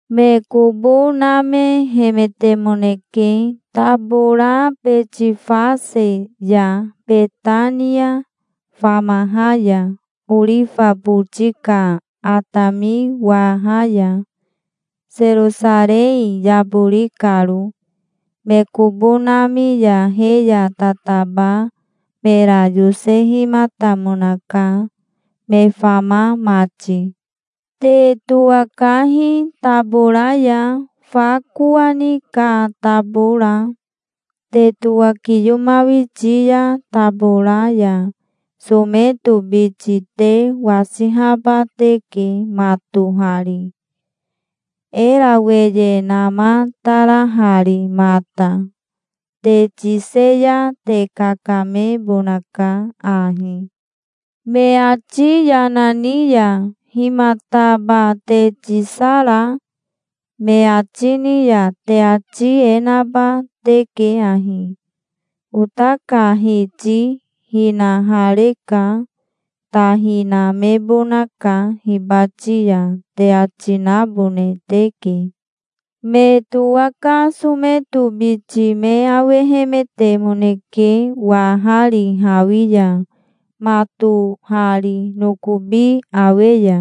Me kobo namehemetemoneke, tabora Betifase ya Betania famaha ya orifa boti ka atami waha ya, Serosarei yabori karo. Me kobo nami ya he ya tataba mera yosehimatamonaka, me fama mati. "Te towakahi tabora ya, fa kowani ka tabora. Te towakiyomawiti ya tabora ya someto biti te wasihaba teke matohari, era weye namatarahari mata. Te tise ya te kakamebonaka ahi. Me ati yana ni ya 'Himataba te tisara?' me ati ni ya te ati e naba teke ahi: 'Ota ka Hiti hinahareka. Ta hinamebonaka hibati ya', te ati nabone teke". Me towaka someto biti me awehemetemoneke, wahari hawi ya, matohari nokobi awe ya.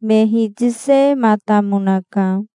Me hitisematamonaka.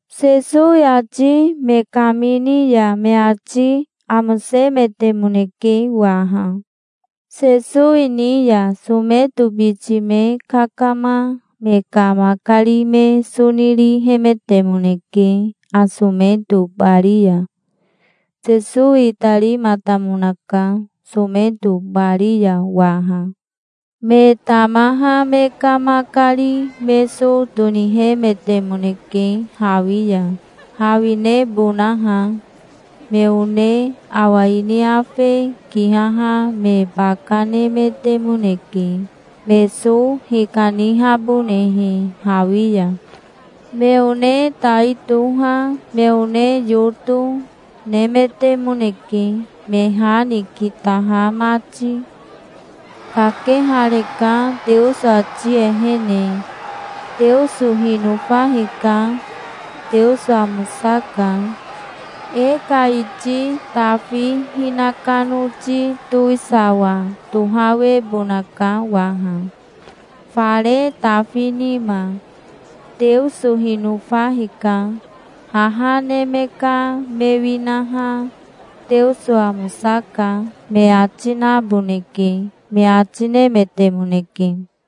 Sesowi ati me kamini ya me ati amosemetemoneke waha. Sesowi ni ya someto biti me kakama me ka makari me so nirihemetemoneke asometo bari ya. Sesowi itarimatamonaka, someto bari ya waha. Me tamaha me ka makari me so tonihemetemoneke hawi ya, hawinebonaha. Me one awa ini afe kihaha me baka nemetemoneke, me so hikanihabonehe hawi ya. Me one tai toha, me one yoto, nemetemoneke, me ha ni kitaha mati. "Kakehareka Teoso ati ehene. Teoso hinofa hika. Teoso amosaka. E ka iti Tafi hinaka noti towisawa tohawebonaka waha, fare Tafi nima. Teoso hinofa hika. Haha neme ka me winaha 'Teoso amosaka', me ati naboneke", me ati nemetemoneke.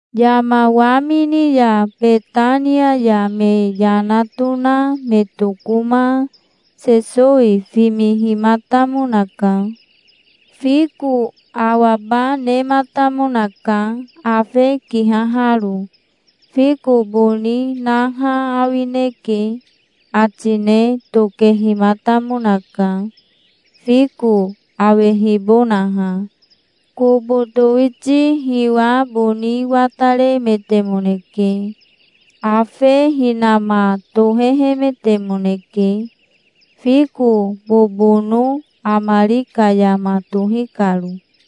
Yama wamini ya Betania ya me yana tona me tokoma Sesowi fimihimatamonaka. Fiko awaba nematamonaka, afe kihaharo. "Fiko boni naha awineke", ati ne tokehimatamonaka, fiko awehibonaha. Kobo towiti hiwa boni wataremetemoneke. Afe hinama tohehemetemoneke, fiko bobono amari ka yama tohi karo.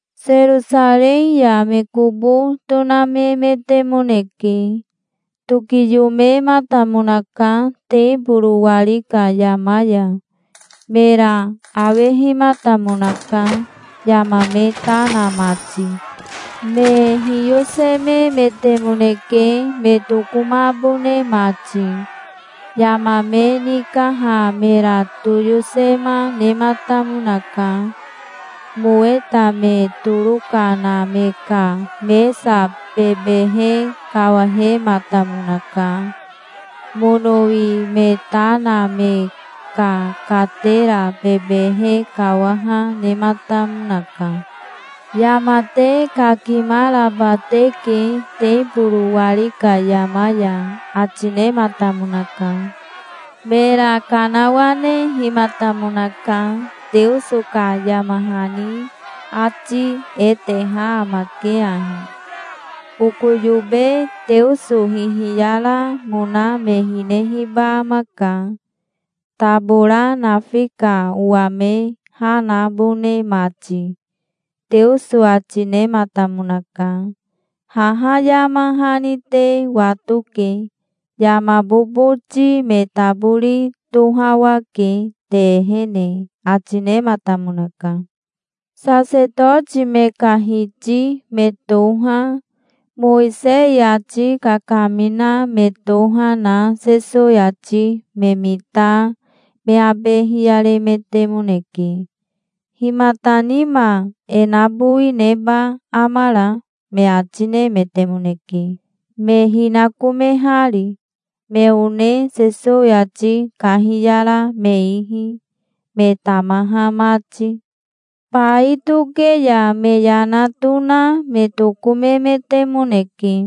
Serosarei ya me kobo tonamemetemoneke. Tokiyomematamonaka teboro wari ka yama ya. Mera awehimatamonaka, yama me ta na mati. Me hiyosememetemoneke, me tokomabone mati. Yama me nikaha mera toyosema nematamonaka. Moweta me toroka na me ka mesa bebehe kawahematamonaka. Monowi me ta na me ka katera bebehe kawaha nematamonaka. "Yama te kakimaraba teke teboro wari ka yama ya", ati nematamonaka. Mera kanawanehimatamonaka. "Teoso ka yama hani ati e teha amake ahi: 'Oko yobe Teoso hihiyaramona me hinehiba amaka, tabora nafi ka owa me ha nabone mati', Teoso ati nematamonaka. Haha yama hani te watoke. Yama boboti me tabori tohawake te ehene", ati nematamonaka. Sasetoti me ka hiti me toha, Mowisei ati kakamina me toha, na Sesowi ati me mita me abe hiyaremetemoneke. "Himata nima e nabowi neba amara?" me ati nemetemoneke, me hinakomehari, me one Sesowi ati kahiyara me ihi, me tamaha mati. Bai toke ya me yana tona me tokomemetemoneke.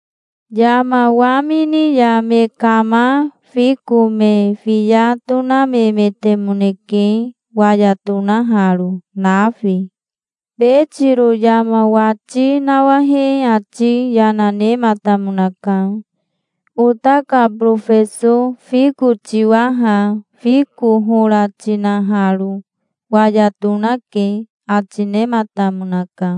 Yama wamini ya me kama fiko me fiya tonamemetemoneke, waya tonaharo, nafi. Betiro yama wati nawahe ati yana nematamonaka. "Ota ka borofeso fiko tiwa ha, fiko hora tinaharo. Waya tonake", ati nematamonaka.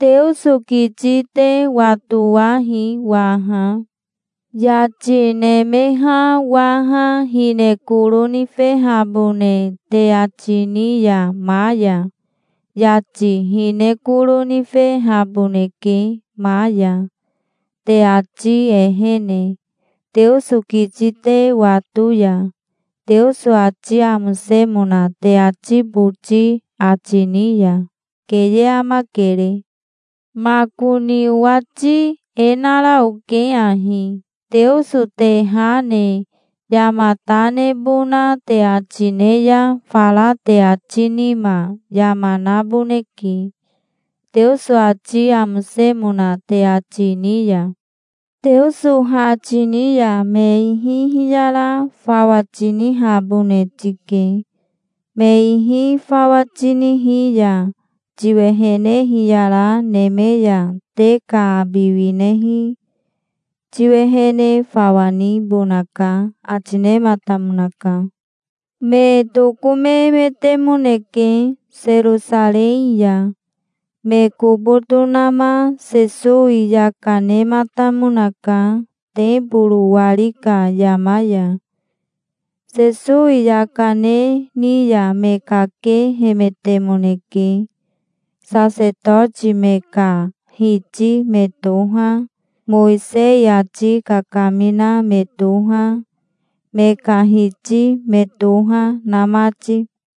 "Teoso kiti te watowahi waha. Yati nemeha waha hine koro nifehabone te ati ni ya ma ya, yati hine koro nifehaboneke ma ya, te ati ehene, Teoso kiti te wato ya, Teoso ati amosemona te ati boti ati ni ya. Keye amakere. Makoni owati e nara oke ahi: Teoso te ha ne yama ta nebona te ati ne ya, fara te ati nima yama naboneke, Teoso ati amosemona te ati ni ya. Teoso ha tini ya me ihi hiyara fawa tinihabone tike. Me ihi fawa tinihi ya tiwehene hiyara neme ya te ka abi winehi tiwehene fawa nibonaka", ati nematamonaka. Me tokomemetemoneke Serosarei ya. Me kobo tonama Sesowi yaka nematamonaka teboro wari ka yama ya. Sesowi yaka ne ni ya me kakehemetemoneke, sasetoti me ka hiti me toha, Mowisei ati kakamina me toha, me ka hiti me toha, na mati.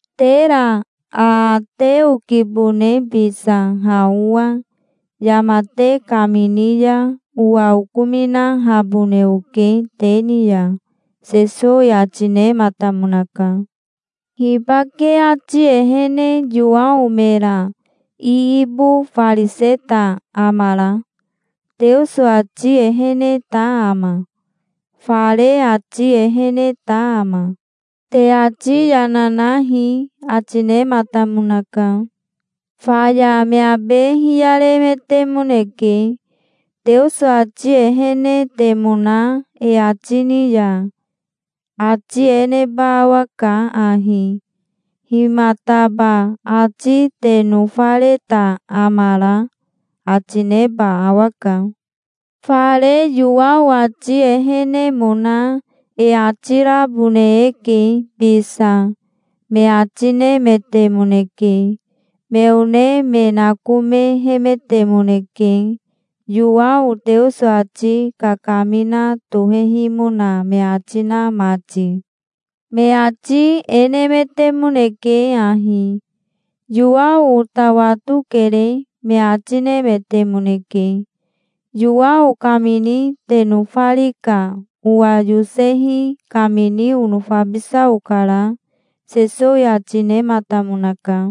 "Tera aate okibone bisa ha owa. Yama te kamini ya owa okominahabone oke te ni ya", Sesowi ati nematamonaka. "Hibake ati ehene Yowao mera iibofariseta amara? Teoso ati eheneta ama? Fare ati eheneta ama? Te ati yana nahi", ati nematamonaka. Faya me abe hiyaremetemoneke. "Teoso ati ehenetemona e ati ni ya ati e neba awaka ahi: 'Himataba ati te nofareta amara?' ati neba awaka. Fare Yowao ati ehenemona e ati rabone eke bisa", me ati nemetemoneke. Me one me nakomehemetemoneke, Yowao Teoso ati kakamina tohehimona me ati na mati. Me ati e nemetemoneke ahi: "Yowao ota watokere", me ati nemetemoneke. "Yowao kamini te nofari ka owa yosehi kamini onofabisa okara", Sesowi ati nematamonaka.